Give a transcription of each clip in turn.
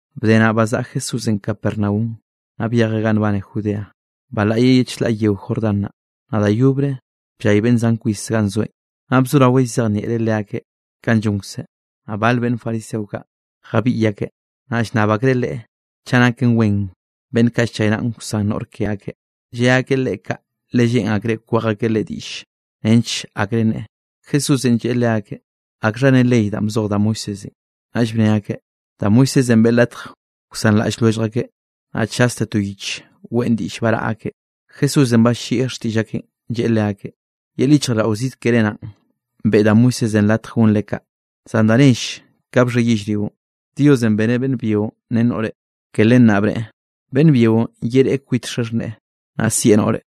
Bde naꞌ, bzaꞌa Jesúsenꞌ Capernaum, naꞌ byejeꞌ ganꞌ nbane Judea, balaꞌyeꞌ ye chlaꞌ yeo Jordán naꞌ. Naꞌ da yobre bllay beꞌnn zan kwis ganꞌ zoeꞌn, naꞌ bzoraweꞌ llzejnieꞌreꞌ leakeꞌ kanꞌ llonkzeꞌ. Naꞌ bal beꞌnn fariseo kaꞌ jabiꞌy akeꞌ, naꞌ llnnab akreꞌ Leꞌe chaꞌ naken wen beꞌnn kaꞌ nchaynaꞌa wsan noꞌr ke akeꞌ. Lle akeꞌ Leꞌe kaꞌ, le lleꞌn akreꞌ kwej akeꞌ Leꞌe diꞌll nench akre nneꞌe. Jesúsenꞌ lleꞌe leakeꞌ: —¿Akxha ne ley danꞌ bzoj da Moisésenꞌ? Naꞌll bne akeꞌ: —Da Moisésenꞌ beꞌe latj wsanraꞌll lwellj akeꞌ, naꞌ chaste to yich weꞌn diꞌll baraꞌa akeꞌ. Jesúsenꞌ ballieꞌ xtiꞌll akeꞌn, lleꞌe leakeꞌ: —Yel yichjraꞌlldaꞌo zid keré naꞌn, beꞌe da Moisésenꞌ latj gonre kaꞌ. Zan da nell ka bxhe yellrionꞌ, “Diosenꞌ beneꞌ beꞌnn byio ren noꞌre.” Ke len naꞌ bneꞌe: “Beꞌnn byio yereꞌe kwit xaxhneꞌe, naꞌ sieꞌ noꞌre,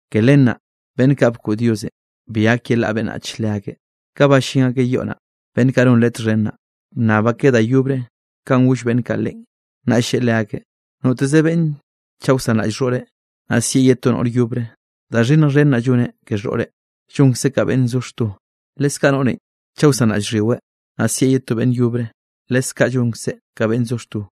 Ke len naꞌ, beꞌnn ba bkoꞌd Diosenꞌ, bi gak yelaꞌa beꞌnnach leakeꞌ. Ka ballín akeꞌ yoꞌ naꞌ, beꞌnn kaꞌ non Leꞌe txhen naꞌ, bnnab akeꞌ da yobre kanꞌ goll beꞌnn kaꞌ Leꞌen. Naꞌll lleꞌe leakeꞌ: —Noteze beꞌnn chaꞌ wsanraꞌll xhoꞌreꞌ, naꞌ sieꞌ ye to noꞌr yobre, da xhinnj xhen naꞌ lloneꞌ ke xhoꞌreꞌ, llonkzeꞌ ka beꞌnn zo xto. Leskaꞌ noꞌrenꞌ chaꞌ wsanraꞌll xhyiweꞌ, naꞌ sieꞌ ye to beꞌnn yobre, leskaꞌ llonkzeꞌ ka beꞌnn zo xto.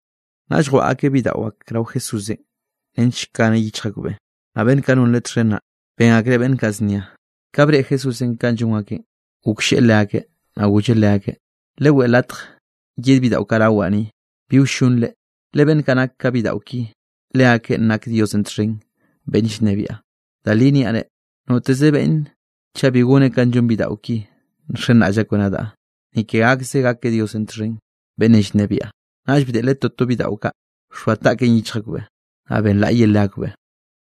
Naꞌll jwaꞌa akeꞌ bidaꞌo ak rao Jesúsenꞌ nench kaneꞌ yichj akbeꞌ, naꞌ beꞌnn kaꞌ non Leꞌe txhen naꞌ, ben akreꞌ beꞌnn kaꞌ znia. Ka breꞌe Jesúsenꞌ kanꞌ llon akeꞌn, goklleꞌe leakeꞌ, naꞌ golleꞌ leakeꞌ: —Leweꞌe latj yed bidaꞌo kaꞌ rawaꞌ ni, bi wllonre; le beꞌnn kaꞌ nak ka bidaꞌo ki, leakeꞌn nak Diosenꞌ txhen beꞌnn llnebiaꞌ. Da li niaꞌ reꞌ, noteze beꞌnne chaꞌ bi goneꞌ ka llon bidaꞌo ki nxenraꞌll akbeꞌ nadaꞌ, ni ke gakzeꞌ gakeꞌ Diosenꞌ txhen beꞌnnenꞌ llnebiaꞌ. Naꞌll bdeꞌleꞌ toto bidaꞌo kaꞌ, bxoa taꞌkeꞌn yichj akbeꞌn, naꞌ benlaꞌyeꞌ leakbeꞌ.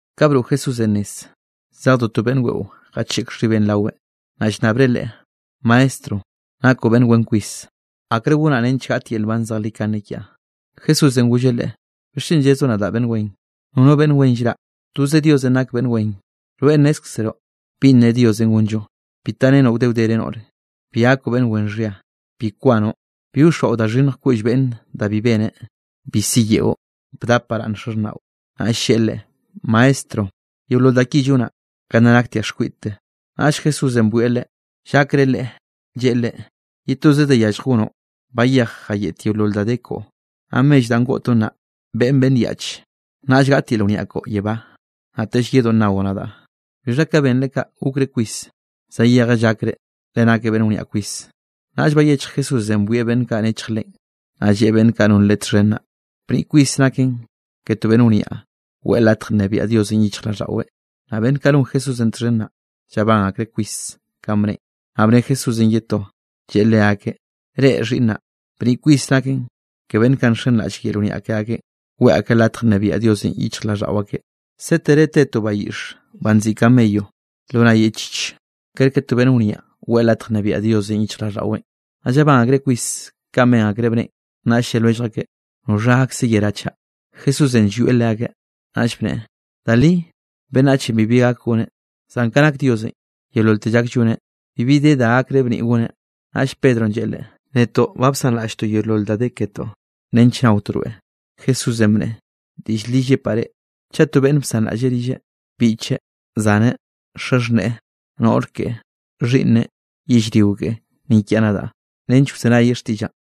Ka broꞌ Jesúsenꞌ nez, zejdo to beꞌnn weꞌo jacheꞌk xhibeꞌ raweꞌn, naꞌ llnnabreꞌ Leꞌe: —Maestro, nakoꞌ beꞌnn wen kwis, ¿akre gonaꞌ nench gaꞌt yel nban zejlikane kiaꞌ? Jesúsenꞌ golleꞌ Leꞌe: —¿Bixchen llezoꞌ nadaꞌ beꞌnn wen? Nono beꞌnn wen llraꞌ, toze Diosenꞌ nak beꞌnn wen. Rweꞌ nnezkzroꞌ binꞌ ne Diosenꞌ gonllo: “Bi tarenoꞌ wde wdere noꞌre, bi gakoꞌ beꞌnn wen xhia, bi kwanoꞌ, bi wxoaꞌo da xhinnj koꞌll beꞌnne da bi beneꞌ, bi siyeꞌo, bdap baraꞌnn xaxhnaꞌo.” Naꞌll lleꞌe Leꞌe: —Maestro, yeolol da ki llonaꞌ ka nna naktiaꞌ xkwiꞌdte. Naꞌll Jesúsenꞌ bwieꞌ leꞌe, llakreꞌ leꞌe, lleꞌe leꞌe: —Ye toze da yallj gonoꞌ; bayej jayeꞌt yeolol da de koꞌo, naꞌ mell danꞌ goꞌtoꞌn naꞌ, beꞌen beꞌnn yaꞌch, naꞌll gaꞌt yel wniaꞌ koꞌo yebá, naꞌtell yedoꞌ nnaoꞌ nadaꞌ. Bixha ka benreꞌ kaꞌ, gokreꞌ kwis, zayejeꞌ llakreꞌ, le nakeꞌ beꞌnn wniaꞌ kwis. Naꞌll bayechj Jesúsenꞌ bwieꞌ beꞌnn kaꞌ nechj Leꞌen, naꞌ lleꞌe beꞌnn kaꞌ non Leꞌe txhen naꞌ: —¡Bniꞌ kwis naken ke to beꞌnn wniaꞌ, weꞌe latj nnebiaꞌ Diosenꞌ yichjraꞌlldaꞌweꞌ! Naꞌ beꞌnn kaꞌ non Jesúsenꞌ txhen naꞌ, llabán akreꞌ kwis kanꞌ bneꞌen, naꞌ bne Jesúsenꞌ ye to, lleꞌe leakeꞌ: —Reꞌ, xhiꞌnnaꞌ, bniꞌ kwis naken ke beꞌnn kaꞌ nxenraꞌll yel wniaꞌ ke akeꞌn, weꞌe akeꞌ latj nnebiaꞌ Diosenꞌ yichjraꞌlldaꞌo akeꞌ. Sétere te to bayiꞌxe banꞌ nziꞌi camello lo nay yeꞌchich, kerke to beꞌnn wniaꞌ weꞌe latj nnebiaꞌ Diosenꞌ yichjraꞌlldaꞌweꞌn. Naꞌ llabán akreꞌ kwis kanꞌ ben akreꞌ bneꞌen, naꞌll lle lwellj akeꞌ: —¿Noxha gakze yerá chaꞌ? Jesúsenꞌ llwieꞌ leakeꞌ, naꞌll bneꞌe: —Da li beꞌnnachenꞌ bibi gak goneꞌ, zan ka nak Diosenꞌ, yeololte llak lloneꞌ, bibi de da gakreꞌ bniꞌ goneꞌn. Naꞌll Pedronꞌ lleꞌe Leꞌe: —Netoꞌ ba bsanraꞌlltoꞌ yeolol da de ketoꞌ nench naotoꞌ rweꞌ. Jesúsenꞌ bneꞌe: —Diꞌll li llepaꞌ reꞌ, chaꞌ to beꞌnne bsanraꞌlleꞌ rilleꞌ, biꞌcheꞌ, zaneꞌ, xaxhneꞌe, noꞌr keꞌe, xhiꞌnneꞌ, yellrio keꞌe, ni kiaꞌ nadaꞌ nench wzenayeꞌ xtiꞌllaꞌn,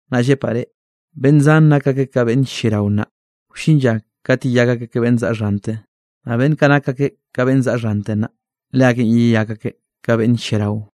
Naꞌ llepaꞌ reꞌ, beꞌnn zan nak akeꞌ ka beꞌnn lliarao nnaꞌ, wllin lla kat yeyak akeꞌ ka beꞌnn zaꞌa xhante, naꞌ beꞌnn kaꞌ nak akeꞌ ka beꞌnn zaꞌa xhante nnaꞌ, leakeꞌn yeyak akeꞌ ka beꞌnn lliarao.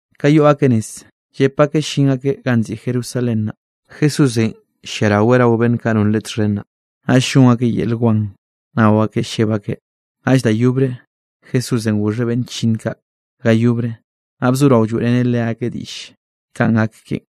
Ka yoꞌ akeꞌ nez, llep akeꞌ llin akeꞌ ganꞌ nziꞌi Jerusalén naꞌ, Jesúsenꞌ lliaraweꞌ rao beꞌnn kaꞌ non Leꞌe txhen naꞌ, naꞌll llon akeꞌ yel wan nao akeꞌ lleb akeꞌ. Naꞌll da yobre Jesúsenꞌ goxheꞌ beꞌnn chllinn kaꞌ ga yobre, naꞌ bzorao lloeꞌreneꞌ leakeꞌ diꞌll kanꞌ gak keꞌen.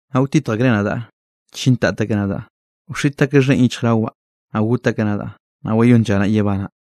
Naꞌ wtitj akreꞌ nadaꞌ, chintat akeꞌ nadaꞌ, wxiꞌt akeꞌ xheꞌn yichjrawaꞌ, naꞌ got akeꞌ nadaꞌ. Naꞌ wayónn lla naꞌ yebanaꞌ.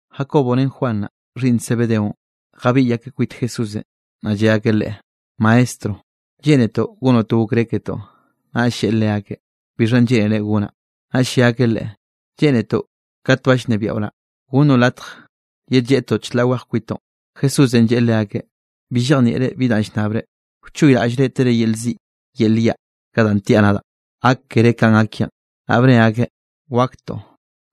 Jacobonꞌ ren Juan naꞌ, xhiꞌnn Zebedeonꞌ, jabiꞌy akeꞌ kwit Jesúsenꞌ, naꞌ lle akeꞌ Leꞌe: —Maestro, lleꞌnetoꞌ gonoꞌ to okré ketoꞌ. Naꞌll lleꞌe leakeꞌ: —¿Bixhanꞌ lleꞌnere gonaꞌ? Naꞌll lle akeꞌ Leꞌe: —Lleꞌnetoꞌ kat ba llnebiaꞌo naꞌ, gonnoꞌ latj yedlleꞌtoꞌ chlaꞌ wej kwitoꞌn. Jesúsenꞌ lleꞌe leakeꞌ: —Bi llejnieꞌre bi danꞌ llnnabre. ¿Wchoyraꞌllre tere yel ziꞌ yel yaꞌ, ka danꞌ tiaꞌ nadaꞌ, gak keré kanꞌ gak kiaꞌn? Naꞌ bne akeꞌ: —Waktoꞌ.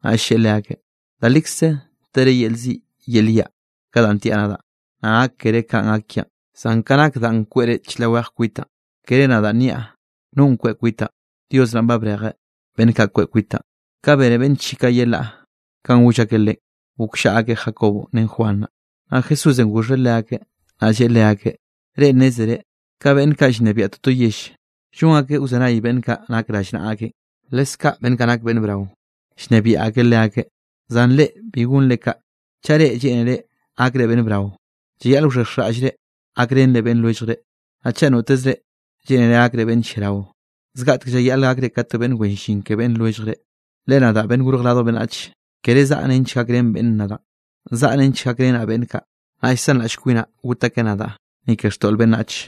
Naꞌll lleꞌe leakeꞌ: —Da likze tere yel ziꞌ yel yaꞌ, ka danꞌ tiaꞌ nadaꞌ, naꞌ gak keré kanꞌ gak kiaꞌn. Zan ka nak danꞌ kweꞌre chlaꞌ wej kwitaꞌn, kere nadaꞌ nniaꞌ no kweꞌ kwitaꞌn, Dios naꞌn ba brejeꞌ beꞌnn kaꞌ kweꞌ kwitaꞌn. Ka bene beꞌnn ye chi kaꞌ yelaꞌ kanꞌ goll akeꞌ Leꞌen, gokllaꞌa akeꞌ Jacobonꞌ ren Juan naꞌ. Naꞌ Jesúsenꞌ goxheꞌ leakeꞌ, naꞌ lleꞌe leakeꞌ: —Reꞌ nnézere ka beꞌnn kaꞌ llnebiaꞌ toto yell, llon akeꞌ wzenay beꞌnn kaꞌ nak rallnaꞌa akeꞌn, leskaꞌ beꞌnn kaꞌ nak beꞌnn brao, llnebiaꞌ akeꞌ leakeꞌ. Zan reꞌ bi gonre kaꞌ, chaꞌ reꞌ lleꞌnere gakre beꞌnn brao, llayaꞌl wxhexjraꞌllre gakrenre beꞌnn lwelljre. Naꞌ chaꞌ notezre lleꞌnere gakre beꞌnn lliarao, zgaꞌtek llayaꞌle gakre ka to beꞌnn wen llin ke beꞌnn lwelljre. Le nadaꞌ, Beꞌnn Gorj Radj Beꞌnnach, kere zaꞌa nench gakrén beꞌnn nadaꞌn, zaꞌa nench gakrenaꞌ beꞌnn kaꞌ, naꞌ llsanraꞌll kwinaꞌ got akeꞌ nadaꞌ, ni ke xtoꞌl beꞌnnach.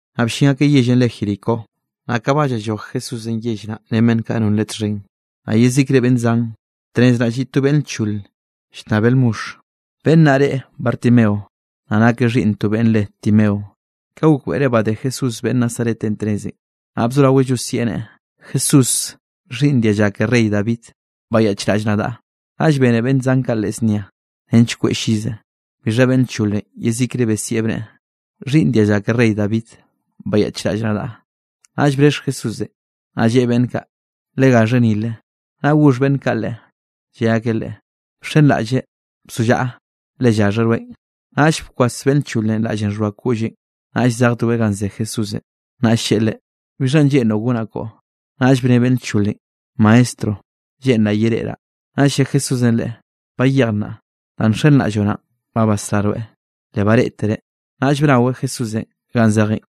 Naꞌ bllin akeꞌ yellenꞌ re Jericó. Naꞌ ka ba llalloj Jesúsenꞌ yell naꞌn ren beꞌnn kaꞌ non Leꞌe txhen, naꞌ yezikre beꞌnn zan, tnez naꞌ lliꞌ to beꞌnn lchole llnnabeꞌ lmoxh. Beꞌnn naꞌ re Bartimeo, naꞌ nakeꞌ xhiꞌnn to beꞌnn re Timeo. Ka gokbeꞌreꞌ badé Jesús beꞌnn Nazaretenꞌ tnezenꞌ, naꞌ bzoraweꞌ llosieꞌ neꞌe: —¡Jesús, xhiꞌnn dialla ke rey David, bayaꞌchraꞌll nadaꞌ! Naꞌll bene beꞌnn zan kaꞌ leꞌe znia nench kweꞌe llize, bixha beꞌnn lcholenꞌ yezikre besieꞌ bneꞌe: —¡Xhiꞌnn dialla ke rey David, bayaꞌchraꞌll nadaꞌ! Naꞌll brexh Jesúsenꞌ, naꞌ lleꞌe beꞌnn kaꞌ: —Legaxheꞌ nile. Naꞌ goxh beꞌnn kaꞌ leꞌe, lle akeꞌ leꞌe: —Bxenraꞌlle, bzollaꞌa, le llaxheꞌ rweꞌn. Naꞌll bkwas beꞌnn lcholenꞌ raꞌllenꞌ xhoa koꞌlleꞌn, naꞌll zejdoeꞌ ganꞌ ze Jesúsenꞌ. Naꞌll lleꞌe leꞌe: —¿Bixhanꞌ lleꞌnroꞌ gonaꞌ koꞌo? Naꞌll bne beꞌnn lcholenꞌ: —Maestro, lleꞌnraꞌ yereꞌraꞌ. Naꞌll lle Jesúsenꞌ leꞌe: —Bayej nnaꞌ, danꞌ nxenraꞌlloꞌ naꞌn ba basrá rweꞌ. Le bareꞌtereꞌ, naꞌll bnaweꞌ Jesúsenꞌ ganꞌ zejeꞌn.